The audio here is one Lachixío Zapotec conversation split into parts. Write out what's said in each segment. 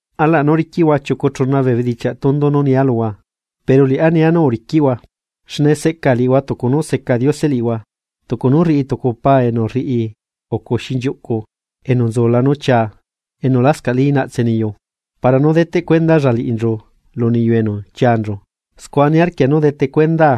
Alaꞌ nú riquiꞌhua chiucu chuna bee bedichiaꞌ tundu nú nia luhua, pero liꞌá nia nú uriquiꞌhua. Xne seꞌca liꞌihua tucu nú seca Diose liꞌihua. Tucu nú rriꞌi tucu pa enu rriucu xinchiuꞌcu enu nzula nú chiaa enu lascaꞌli naꞌtse niyu para nú deteꞌcuendalla liꞌinchu lu niyu enu chianchu. Scua niarquia nú detecuendaa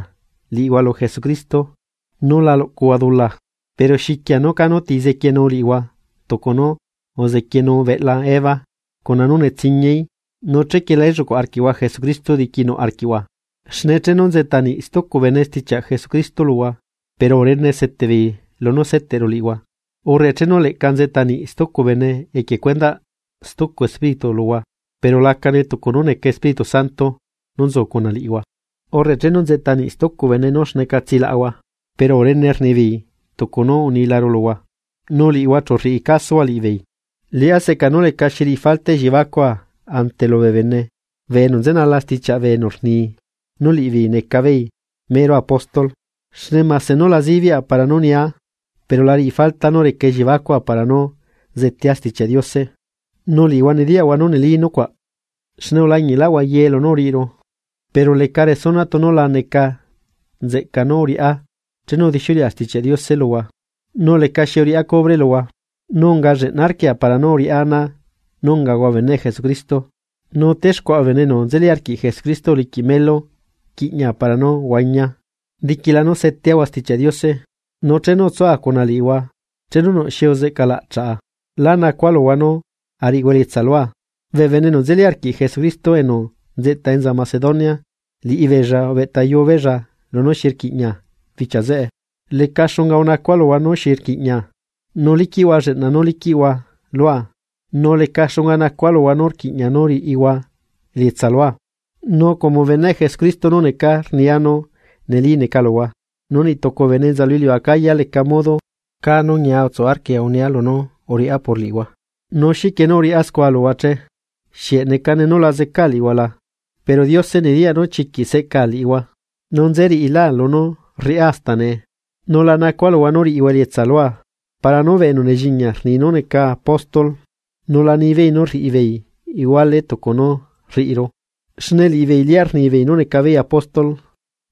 liꞌihua lu Jesucristo nú la luꞌcuhua dula. Pero xiquia nú canu ti zequienu liꞌihua tucu nú uzequienu beꞌla Eva cuna nú netsiñiaí, nu chequie la elluꞌcuaꞌ arquiꞌhua Jesucristo diquinuꞌ arquiꞌhua. Xne chenu nzeꞌta niꞌ stucu bene stichiaꞌ Jesucristo luhua, pero urene seteꞌbeei lunú seteꞌru liꞌihua, urre chenu leꞌca nzeꞌta niꞌ stucu bene equie cuendaꞌ stucu espíritu luhua, pero lacane tucu nú neca Espíritu Santo nú nzu cuna liꞌihua, urre chenu nzeꞌta niꞌ stucu bene nú xneca tsilaꞌahua, pero urene rnibeei tucu nú unilaru luhua, nu liꞌihua chu rriꞌi casuhua liꞌibeei. Liꞌá seꞌca nú lecaxi rriꞌi falta elliebacua ante lubee bene bee enu nzenala stichiaꞌ bee enu rni nú liꞌibeei neca beei mero apóstol. Xne mase nú la zibiaꞌa para nú nia, pero la riꞌi falta nú reca elliebacua para nú zetea Stichiaꞌ Diose, nu liꞌihua nediyaꞌhua nú neli nucuaꞌ xne ulañiꞌlaꞌhua ye lunú uriꞌiru. Pero ¿leca resuna tunu la neca nzeꞌca nú uriꞌá chenu udixiuleꞌa Stichiaꞌ Diose luhua nu lecaxi uriꞌá cubre luhua?, nu unga lleꞌna arquia para nú uriꞌá ana nú ungahua beneꞌ Jesucristo. Nu texcuaꞌa bee bene enu nzeli arquiꞌ Jesucristo uliquiꞌ melu quiꞌña para nú huañia, diquila nú seteahua Stichiaꞌ Diose. Nu chenu utsua cuna liꞌihua, chenu nuꞌ xi uzeꞌca laꞌchaꞌa, lá nacua luhua nú ariꞌihua elietsa lua, bee bene enu nzeli arquiꞌ Jesucristo enu nzeꞌta enza Macedonia liꞌibeella ubeꞌtayuu beella lunú xi rquiꞌña bichia zeꞌe. Leca xunga unacua luhua nú xi rquiꞌña nú liquiꞌhua lleꞌna nú liquiꞌhua lua, nu leca xunga nacua luhua nú rquiꞌña nú riꞌihua elietsa lua. Nu como beneꞌ Jesucristo nú necaa rnia nú neli neca luhua, nu niꞌtucu bee bene enza lu iliu Acaya leca modo caá nú ñia utsu arquia unia lunú uriꞌá por liꞌihua. Nu ¿xiquie nú uriꞌá scua luhua che? ¿Xieꞌ necane nu la zecaa liꞌihua la? Pero Diose nediyaꞌ nú chiquiꞌ seꞌcaa liꞌihua. Nu nze riꞌilá lunú rriꞌá hasta nee, nu la nacua luhua nú riꞌihua elietsa lua, para nú bee enu nelliñia rni nú neca apóstol la nibeei nú rriꞌibeei iguale tucu nú rriꞌiru. Xne liꞌibeei lia rnibeei nú neca beei apóstol,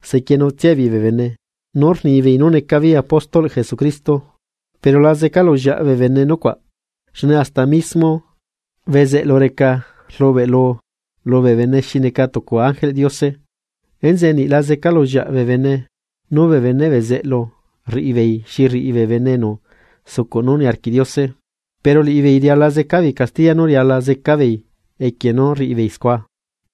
sequienutsia beei bee bene nú rnibeei nú neca beei apóstolꞌ Jesucristo. Pero la zeca lullieaꞌ bee bene nucuaꞌ, xne hasta mismo bezeꞌlu reca rlubeꞌ lubee bene xi neca tucu ángel Diose. Enzeꞌe niꞌ la zeca lullieaꞌ bee bene nú bee beneꞌ bezeꞌlu rriꞌi beei xi rriꞌi bee bene enu sucuꞌ nú niarquiꞌ Diose. Pero liꞌibeei riala zeca beei castiya nú riala zeca beei equie nú rriꞌibeei scua.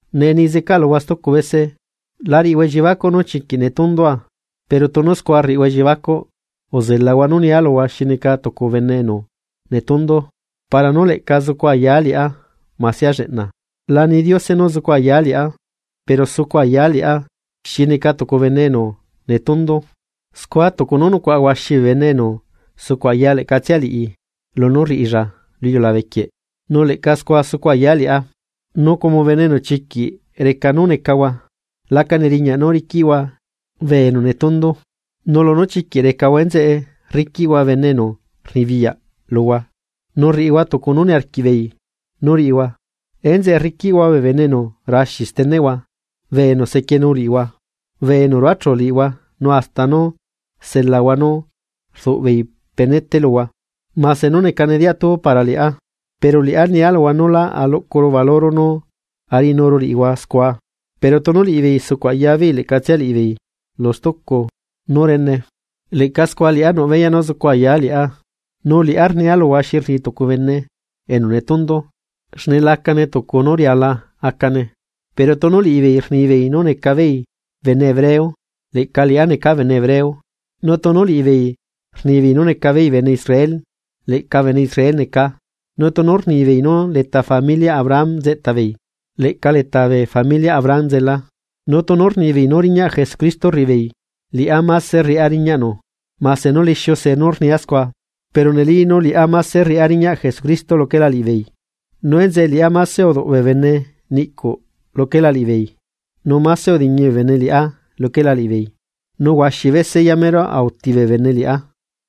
Nee ni zeca luhua stucu bese: La riꞌihua elliebacuꞌ nú chiquiꞌ netundua pero tunu scua rriꞌihua elliebacuꞌ uzelahua nú nia luhua xi neca tucu bene enu netundu para nú leꞌca zucu ayaa liꞌá masia lleꞌna. La ni Diose nú zucu ayaa liꞌá, pero sucu ayaa liꞌá xi neca tucu bene enu netundu. Scua tucu nú nucuaꞌa huaxi bee bene enu sucuꞌ aya leꞌcatsia liꞌi lunú rriꞌilla lu iliulabe quieꞌ, leꞌca scua zucu ayaa liꞌá. Nu como bene enu chiquiꞌ reca nú necahua laca neriñaꞌ nú riquiꞌhua bee enu netundu, nu lunú chiquiꞌ recahua enzeꞌe rriquiꞌhua bene enu rnibiyaꞌ luhua nu rriꞌihua tucu nú niarquiꞌ beei nú riꞌihua, enzeꞌe rriquiꞌhua bee bene enu raxi steneꞌhua, bee enu sequienu liꞌihua, bee enu ruachu liꞌihua nu hasta nú selahua nú rduꞌbeei penete luhua. Mase nú necane diatu para liꞌá, pero liꞌá nia luhua nú lá aluꞌcuru valuro nú ariꞌinuru liꞌihua scua. Pero tunu liꞌibeei sucuꞌ aya beei leꞌcatsia liꞌibeei lu stucu nú rene, leꞌca scua liꞌá nuꞌ beyaꞌ nú zucu ayaa liꞌá, nu liꞌá rnia luhua xi rni tucu bene enu netundu, xne lacane tucu nú riala acane. Pero tunu liꞌibeei rnibeei nú neca beei bene hebreo leꞌca liꞌá neca bene hebreo. Nu tunu liꞌibeei rnibeei nú necabeei bene Israel, leꞌca bene Israel necaa, nu tunu rnibeei nú leta familiaꞌ Abraham nzeꞌta beei, leꞌca leta bee familiaꞌ Abraham nzelaa. Nu tunu rnibeei nú riñaꞌ Jesucristo rriꞌibeei. Liꞌá máse rriꞌá riñaꞌnu, mase nú lixiu see nú rnia scua, pero neli nú liꞌá máse rriꞌá riñaꞌ Jesucristo luquela liꞌibeei. Nu enzeꞌe liꞌá máse uduꞌ bee bene niꞌcuꞌ luquela liꞌibeei, nu máse udiñi bee bene liꞌá luquela liꞌibeei, nu huaxi bese yamero auti bee bene liꞌá.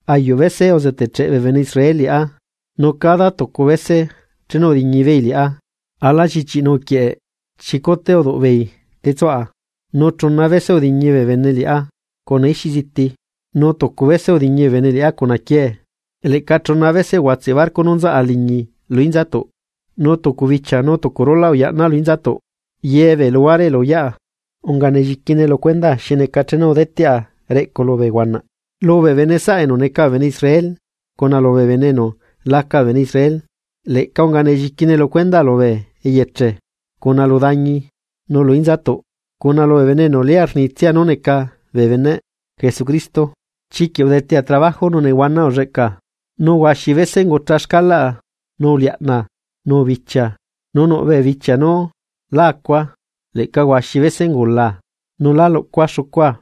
Ayuꞌ bese uzetecheꞌ bee bene Israel liꞌá, nu cada tucu bese chenu udiñi beei liꞌá ala llichiꞌi nuꞌquieꞌ chicute uduꞌbeei tetsuꞌa. Nu chuna bese udiñi bee bene liꞌá cuna ixiꞌ ziti, nu tucu bese udiñi bee bene liꞌá cuna quiee. Leꞌca chuna bese uguatseꞌ barco nú nzaꞌa liñi lu inzatuꞌ, nu tucu bichia nu tucu rulaꞌ uyaꞌnaa lu inzatuꞌ, ye bee luhuare elu uyaꞌa, unga nelliquine lu cuendaa xi neca chenu udeteꞌa reꞌcu lubee huanaꞌ, lubee bene saꞌa enu neca bee bene Israel cuna lubee bene enu laca bee bene Israel. Leꞌca unga nelliquine lu cuendaa lubee eyeche, cuna lu dañi, nu lu inzatuꞌ cuna lubee bene enu lia rnitsia nú neca bee beneꞌ Jesucristo. Chiquiꞌ udetea trabajo nu nehuana ulleꞌca, nu huaxi bese ungucha xcalaꞌa, nu uliaꞌna nu ubichia nu nuꞌ bee bichia nú la acua, leꞌca huaxi bese ungulaa, nu lá luꞌcua xucua.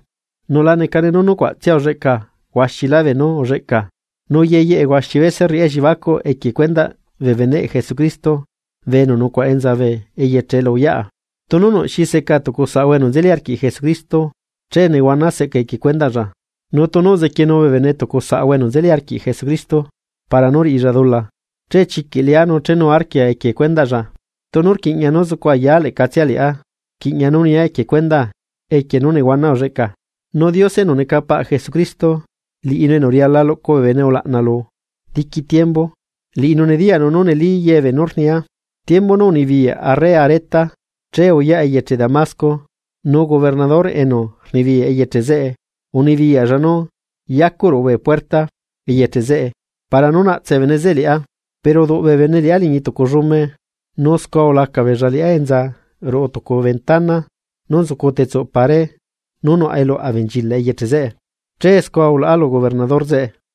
Nu la necane nú nucuaꞌtsia ulleꞌca, huaxilá beenú ulleꞌca. Nu yeyeꞌe huaxi bese rriꞌá elliebacuꞌ equie cuendaꞌ bee beneꞌ Jesucristo bee enu nucuaꞌa enza bee eyeche elu uyaꞌa. Tunu nuꞌxi seca tucu saꞌahua enu nzeli arquiꞌ Jesucristo, che nehuana seꞌca equie cuendaꞌlla. Nu tunu uzequienu bee bene tucu saꞌahua enu nzeli arquiꞌ Jesucristo para nú riꞌilla dula, che chiquiꞌ lea nu chenuarquia equie cuendaꞌlla. Tunu rquiꞌña nú zucu ayaa leꞌcatsia liꞌá, rquiꞌña nú nia equie cuendaa equie nú nehuana ulleꞌcaa. Nu Diose enu neca paꞌ Jesucristo, liꞌinu enu riala luꞌcu bee bene ulaꞌna lu diqui tiembu, liꞌinu nediyaꞌnu nú neli ye beenú rnia. Tiembu nú unibiyaꞌ arre Areta, chee uyaꞌa eyeche Damasco nu gobernador enu rnibiyaꞌ eyeche zeꞌe unibiyaꞌlla nú yacuꞌ ruꞌu bee puerta eyeche zeꞌe para nú naꞌtse bee bene zeꞌe liꞌá. Pero uduꞌ bee bene liꞌá liñi tucu llume, nu scua ulaca beella liꞌá enza ruꞌu tucu ventana nú nzucu tetsuꞌ pared nu nuꞌ eluꞌ abenchilaꞌ eyeche zeꞌe, che scua ulaꞌa lu gobernador zeꞌe.